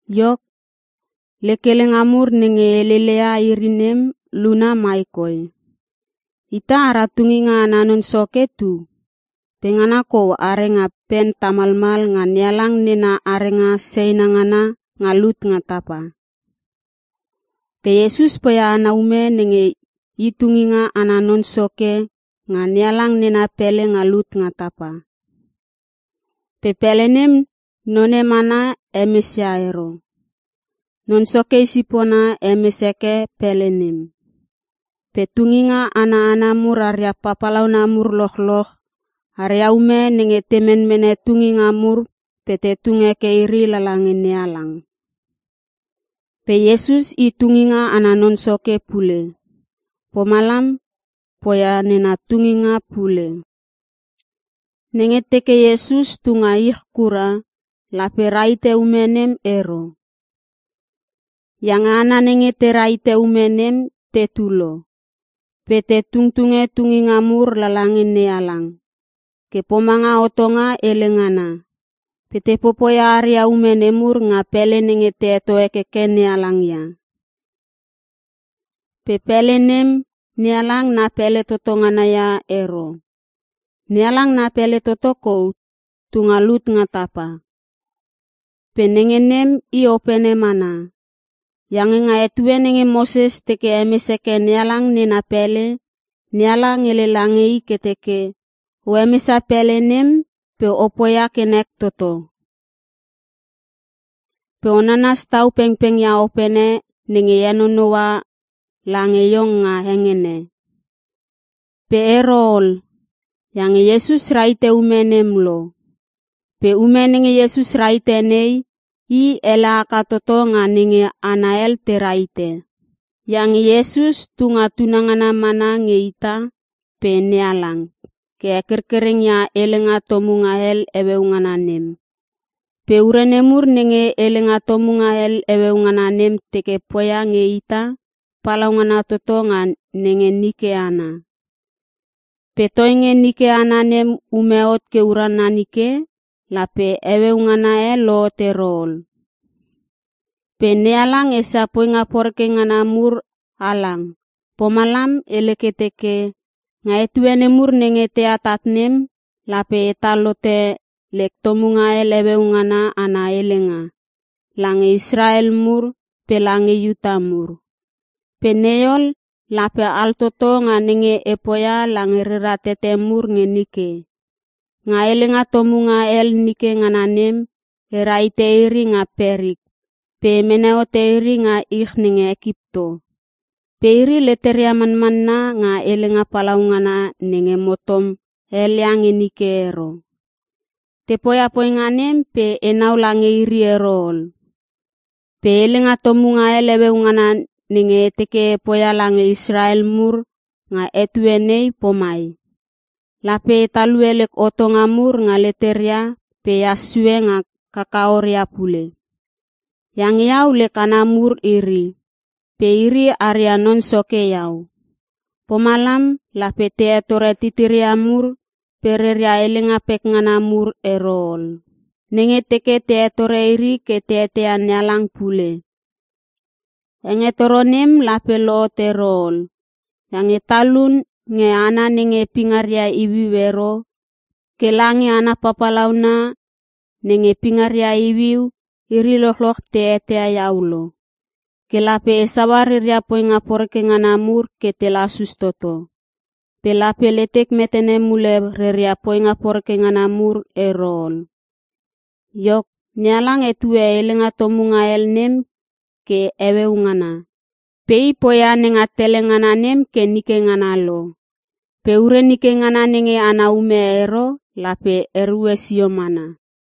Iok, lek helenga mur nenge e heleleia iri nem luna mai koi: Ita ara Tunginga ana Non Soke tu, pe ngana kou are nga pen tamalmal nga NeHalang nena arenga seina ngana nga lut nga tapa. Pe Iesus poia ana ume nenge I Tunginga ana Non Soke nga NeHalang nena pele nga lut nga tapa. Pe pele nem none mana hemesia ero. Non Soke i sipona hemes heke pele nem. Pe tunginga ana hana mur aria papalauna mur lochloch, aria ume nenge te menmene tunginga mur pe te tung heke iri lala nge NeHalang. Pe Iesus i tunginga ana non soke pule, pomalam poia nena tunginga pule. Nenge teke Iesus tunga ich kura, lape rahite ume nem ero. Iange hana nenge te rahite ume nem tetu lo. Pe te tungtunge tunginga mur lala nge NeHalang, ke pomanga hotonga hele ngana. Pe te popoia aria ume nemur nga pele nenge te heto hekeke NeHalang ia. Pe pele nem, NeHalang na pele toto ngana ia ero. NeHalang na pele toto kou tu nga lut nga tapa. Pe nenge nem i opene mana. Iange nga etue nenge Moses teke hemes heke NeHalang nena pele, NeHalang hele lange i ke teke, “O hemesia pele nem, pe o poia ke nek toto. Pe o nanas tau pengpeng ia opene nenge e henonoua lange iong nga hengene.” Pe ero ol, iange Iesus rahite ume nem lo. Pe ume nenge Iesus rahite nei, i ele haka toto nga nenge hana hel te rahite. Iange Iesus tu nga tunangana mana nge ita pe NeHalang, ke hekerkereng ia helenga tomunga hel heueu ngana nem. Pe ure nemur nenge helenga tomunga hel heueu ngana nem teke poia nge ita, palaungana toto nga nenge nike ana. Pe toinge nike ana nem ume hot ke urana nike, lape heueu ngana e lohot ero ol. Pe NeHalang esia poinga poreke ngana mur halang pomalam hele ke teke, “Nga etue nemur nenge te atat nem, lape etal hote lek tomunga hel heueu ngana ana helenga lange Israel mur pe lange Iuta mur. Pe nei ol, lape altoto nga nenge e poia lange reria tete mur nge nike. Nga helenga tomunga hel nike ngana nem, e rahite iri nga perik pe e mene hote iri nga ich nenge Ekipto. Pe iri leteria manmanna, nga helenga palaungana nenge mo tom helia nge nike ero. Te poia poinga nem pe enau lange iri ero ol. Pe helenga tomunga hel heueu ngana nenge e teke e poia lange Israel mur nga etue nei pomai; Lape e talue lek hotonga mur nga leteria pe ehas sue nga kakaoria pule. Iange Iau lek hana mur iri, pe iri aria Non Soke Iau. Pomalam lape te hetore titiria mur pe reria helenga pekngana mur ero ol, nenge te teke te hetore iri ke te eteia NeHalang pule. Hengetoro nem lape lohot ero ol, iange talun nge hana nenge pingaria iuiu ero ke lange hana papalauna nenge pingaria iuiu, iri lochloch te eteia Iau lo. Ke lape e saua reria poinga poreke ngana mur ke te lasus toto. Pe lape letek metene mule reria poinga poreke ngana mur ero ol.” Iok, NeHalang hetue helenga tomunga hel nem ke “Heueu Ngana” Pe i poia nenga tele ngana nem ke nike ngana lo. Pe ure nike ngana nenge ana ume ero, lape erue sio mana.